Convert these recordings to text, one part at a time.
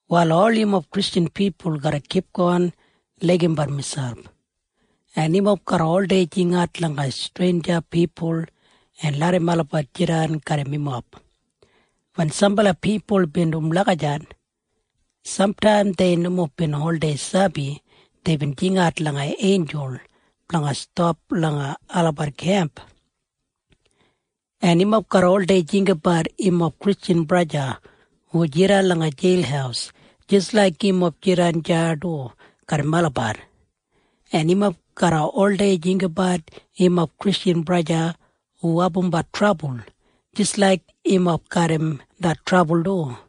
Wal ol yumob Kristjan pipul garra kipgon laigim gija, en yumob garra oldei jingat langa streinja pipul en larram olabat jidan garram yumob. Wen sambala pipul bin dum lagijat, samtaim dei nomo bin sabi deibin jingat langa einjul blanga stap langa olabat kemp. En yumob garra oldei jinggabat yumob Kristjan braja hu jidan langa jeil jis laik yumob jidan deya du garram olabat, en yumob garra oldei jinggabat yumob Kristjan braja en sista hu abumbat trabul jis laik yumob garram det trabul du.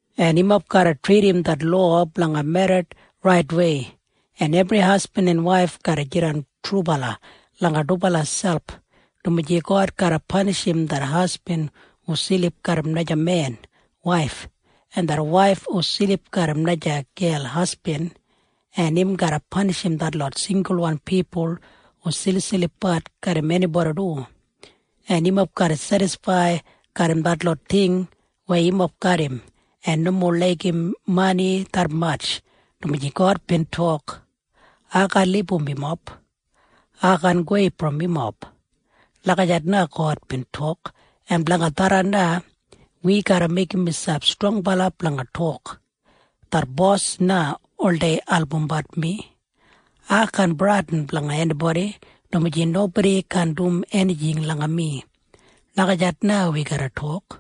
En yumob garra tridim det lowa blanga merrit raitwei, en ebri hasbin en waif garra jidan trubala langa dubala selp, dumaji God garra panishim det hasbin hu silip garram naja men waif en det waif hu silip garram naja gel hasbin, en im garra panishim detlot singulwan pipul hu silipsilipbat garram enibodi du. En yumob garra sedisfaid garram detlot ting weya yumob garram en nomo laigim mani detmatj, dumaji God bin tok, “Ai kaan libum yumob. Ai kaan gowei brom yumob.” Lagijat na God bin tok en blanga tharran na, wi garra meigim miselp strongbala blanga tok, “Det Bos na oldei albumbat mi. Ai kaan bradin blanga enibodi, dumaji nobodi kaan dum enijing langa mi.” Lagijat na wi garra tok.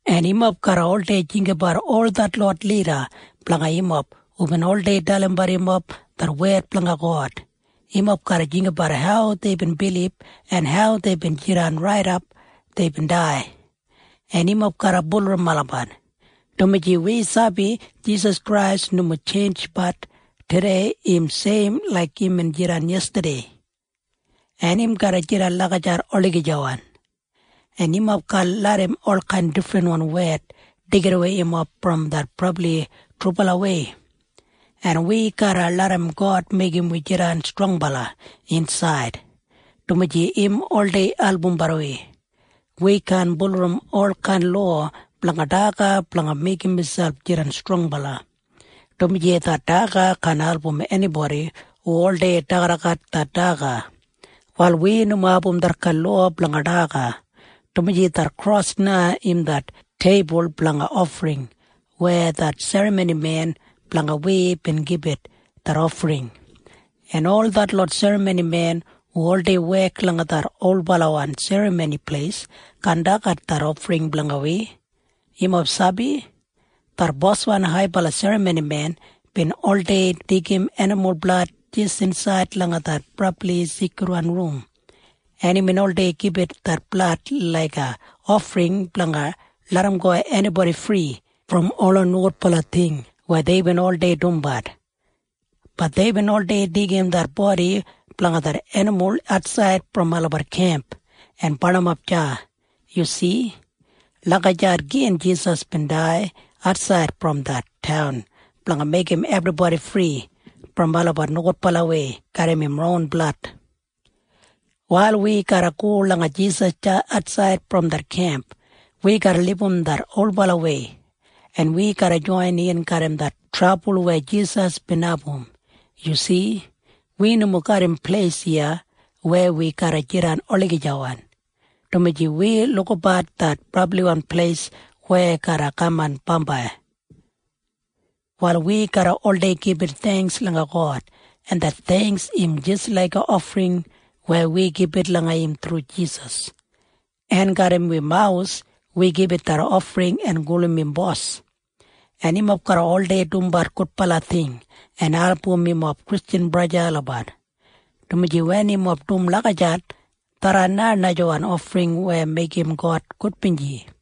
En yumob garra oldei jinggabat ol detlot lida blanga yumob hubin oldei dalimbat yumob det wed blanga God. Yumob garra jinggabat hau deibin bilib en hau deibin jidan raidap deibin dai, en yumob garra bulurrum olabat, dumaji wi sabi Jisas Krais nomo tjeinj. Tudei im seim laik imbin jidan yestadei, en im garra jidan lagijat olagijawan. En yumob kaan larram olkain difrinwan wed deigidawei yumob brom det brabli trubalawei, en wi garra larram God meigim wi jidan strongbala insaid, dumaji im oldei albumbat wi. Wi kaan bulurrum olkain lowa blanga daga blanga meigim miselp jidan strongbala, dumaji det daga kaan album enibodi hu oldei dagadagat det daga. Wal wi nomo abum detkain lowa blanga daga, dumaji det kros na im det teibul blanga ofring weya det serramonimen blanga wi bin gibit det ofring, en ol detlot serramonimen hu oldei wek langa det olbalawan Serramoni Pleis kaan dagat det ofring blanga wi. Yumob sabi? Det boswan haibala serramonimen bin oldei deigim enimul blad jis insaid langa det Brabli Seikridwan Rum, en imbin oldei gibit det blad laiga ofring blanga larramgo enibodi fri brom ola nogudbala ting weya deibin oldei dumbat. Bat deibin oldei deigim det bodi blanga det enimul atsaid brom olabat kemp en barnimap deya. Yu si? Lagijat gin Jisas bin dai atsaid brom det taun blanga meigim ebribodi fri brom olabat nogudbalawei garram im ron blad. Wal wi garra go langa Jisas deya atsaid brom det kemp. Wi garra libum det olbalawei, en wi garra joinin garram det trabul weya Jisas bin abum. Yu si? Wi nomo garram pleis iya weya wi garra jidan olagijawan, dumaji wi lukabat det brabliwan pleis weya garra kaman bambai. Wal wi garra oldei gibit theingks langa God, en det theingks im jis laiga ofring weya wi gibit langa im thru Jisas, en garram wi mawus wi gibit det ofring en gulum im Bos. En yumob garra oldei dumbat gudbala ting en album yumob Kristjan braja en sista olabat, dumaji wen yumob dum lagijat, tharran na najawan ofring weya meigim God gudbinji.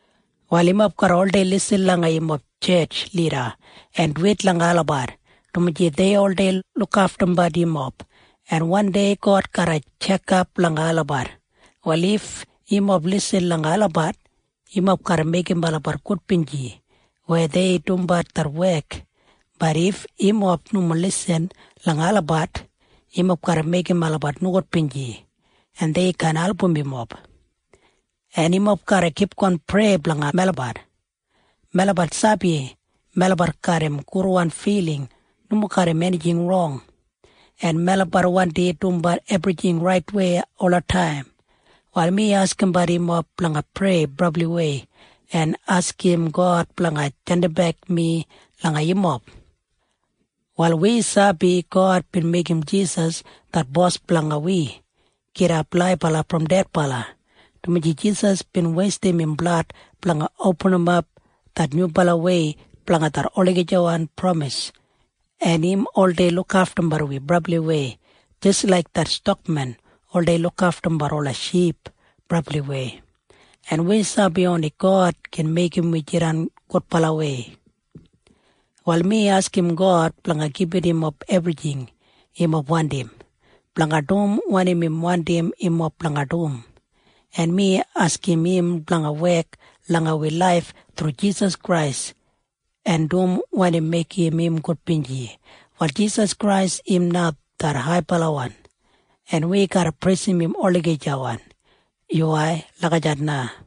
Wal yumob garra oldei lisin langa yumob tjetj lida en duwit langa olabat, dumaji dei oldei lukaftumbat yumob, en wandei God garra tjekap langa olabat. Wal if yumob lisin langa olabat, yumob garra meigim olabat gudbinji weya dei dumbat det wek. Bat if yumob nomo lisin langa olabat, yumob garra meigim olabat nogudbinji, en dei kaan album yumob. En yumob garra kipgon prei blanga melabat. Melabat sabi melabat garram gudwan filing nomo garram enijing rong, en melabat wandi dumbat ebrijing raitwei olataim. Wal mi askimbat yumob blanga prei brabliwei en askim God blanga jandimbek mi langa yumob. Wal wi sabi God bin meigim Jisas det Bos blanga wi gidap laibala brom dedbala, dumaji Jisas bin weistim im blad blanga opinimap det nyubalawei blanga det olagijawan pramis, en im oldei lukaftumbat wi brabliwei jis laik det stakmen oldei lukaftumbat ola ship brabliwei, en wi sabi oni God gin meigim wi jidan gudbalawei. Wal mi askim God blanga gibit yumob ebrijing yumob wandim blanga dum wanim im wandim yumob blanga dum, en mi askim im blanga wek langa wi laif thru Jisas Krais en dum wanim meigim im gudbinji. Wal Jisas Krais im na det haibalawan, en wi garra preisim im olagijawan. Yuwai. Lagijat na.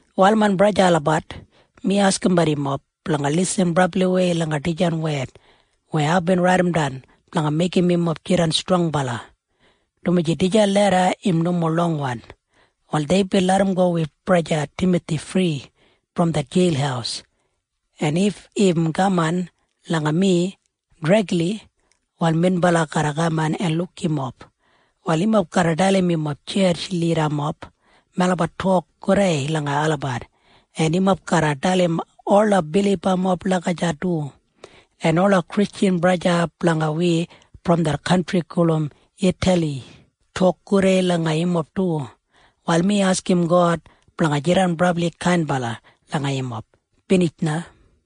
Wal main braja en sista olabat, mi askimbat yumob blanga lisin brabliwei langa dijan wed weya aibin raidimdan blanga meigim yumob jidan strongbala, dumaji dijan leda im nomo longwan. Wal deibin larramgo wi braja Timathi fri brom det jeil, en if im kaman langa mi dregli, wal minbala garra kaman en luk yumob. Wal yumob garra dalim yumob tjetj lidamob melabat tok gudei langa olabat, en yumob garra dalim ola bilibamob lagijat du, en ola Kristjan braja en sista blanga wi brom det kantri gulum Itali tok gudei langa yumob du. Wal mi askim God blanga jidan brabli kainbala langa yumob. Binij na.